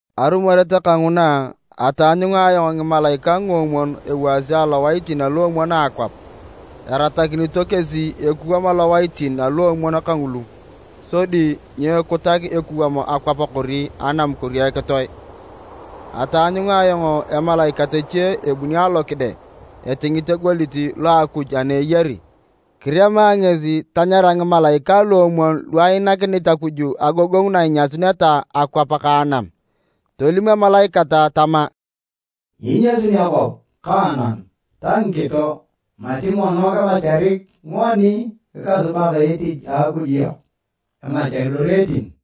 Arumoret kanguna, ataanyunga ayong ngimalaikae nguomwon ewaasi alowaitin aluomwon a akwap. Eratakinito kesi ekuwam alowaitin aluomwon kangulu sodi nyekutak ekuwam akwap kori anam kori ekitoe. Ataanyunga ayong emalaikat eche ebuni alokide etingit egoliet lo a Akuj ana eyari. Kirema ngesi tanyara ngimalaikae luomwon lu ainakinit Akuj agogongu na inyasuneta akwap ka anam. Tolim emalaikat tama, “Nyiinyasut akwap ka anam ta ngikito mati mono kimacharik ngoni ngikasubak etich a Akuj yok emachar loreetin.”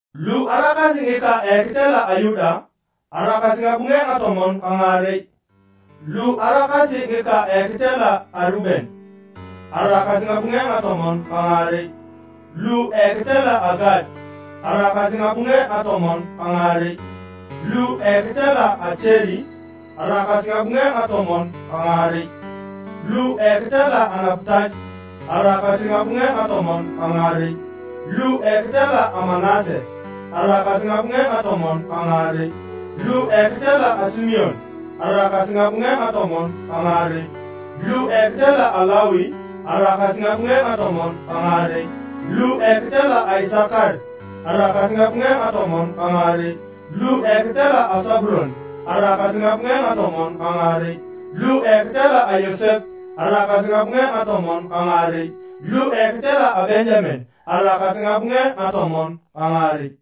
Lu araakasi ngika a ekitela a Yuda, araakasi ngabunge ngatomon ka ngaarei, lu araakasi ngika a ekitela a Reuben, araakasi ngabunge ngatomon ka ngaarei, lu ekitela a Gad araakasi ngabunge ngatomon ka ngaarei, lu ekitela a Acheri, araakasi ngabunge ngatomon ka ngaarei, lu ekitela a Naputal, araakasi ngabunge ngatomon ka ngaarei, lu ekitela a Manase, araakasi ngabunge ngatomon ka ngaarei, lu ekitela a Simeon, araakasi ngabunge ngatomon ka ngaarei, lu ekitela a Lawi, araakasi ngabunge ngatomon ka ngaarei, lu ekitela Isakar, araakasi ngabunge ngatomon ka ngaarei, lu ekitela a Sabulon, araakasi ngabunge ngatomon ka ngaarei, lu ekitela a Yosep, araakasi ngabunge ngatomon ka ngaarei, lu ekitela a Benjamen, araakasi ngabunge ngatomon ka ngaarei.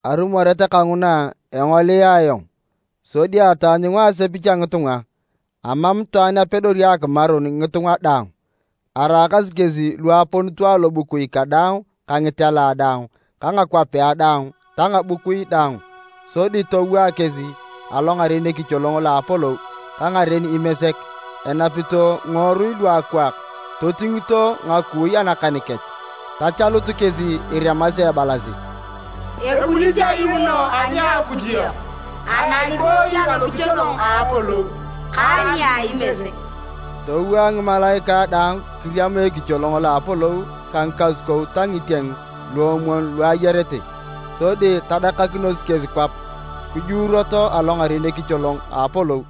Arumoret kanguna engolia ayong, sodi ataanyunga asepich a ngitunga, amam itwaan apedori akimarun ngitunga daang! Araakasi kesi lu aponito alobukui kadaang ka ngitela daang ka ngakwapea daang ta ngabukui daang, sodi towaa kesi alongaren ekicholong lo apolou ka ngaren Imesek, enapito ngiworui luakwaak, totingito ngakui anakan kech. Tachalut kesi iremasi ebalasi, “Ebunit ayuuno ani a Akuj yok, ana ibooyi alokicholong a apolou, ka nia Imesek!” Towaa ngimalaikae daang kiriama ekicholong lo a apolou ka ngikasukou ta ngitieng luomwon lu ayarete. Sodi tadakakinos kesi kwap kijuuroto alongaren ekicholong a apolou,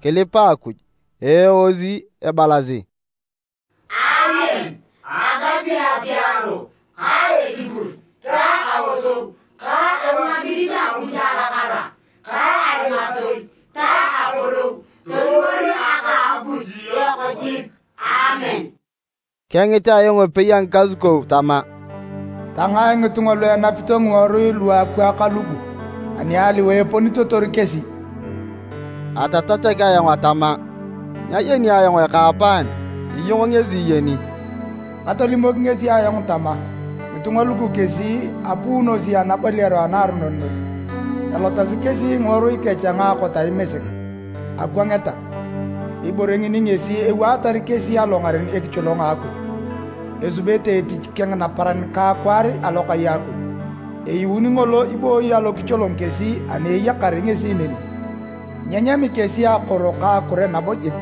kilipa Akuj, eeosi ebalasi, “Aamen! Agasi apiaro ka ekipur ta aosou ka abuakinit Akuj alakara ka arimatoi ta apolou toliwor aka Akuj yok jik! Aamen!” Kengit ayong epei a ngikasukou tama, “Tangae ngitunga lu enapito ngiworui luakwaak lugu, ani aliwae eponitotor kesi?” Atatachak ayong atama, “Nyayeni ayong ekaapaan. Iyong ngesi iyeni.” Katolimok ngesi ayong tama, “Ngitunga lugu kesi apuunosi anaboliaro anaaronon noi. Elotasi kesi ngiworui kech a ngaakot a Imesek, akwangeta. Ibore ngini ngesi ewaatar kesi alongaren ekicholong a Akuj, esubete etich keng naparan ka akwaar alokai a Akuj. Eyuuni ngolo ibooyi alokicholong kesi ani eyakar ngesi neni. Nyenyami kesi akoro ka akure nabo jik,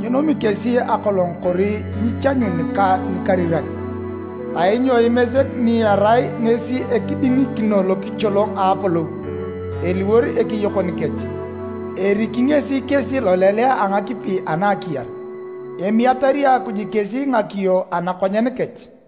nyenomi kesi akolong kori nyichanyun ka nikariran, kainyo Imesek ni erai ngesi ekidingikino lokicholong a apolou, eliwor ekeyokon kech, eriki ngesi kesi lolelea a ngakipi ana a akiyar. Emiatari Akuj kesi ngakiyo anakonyen kech.”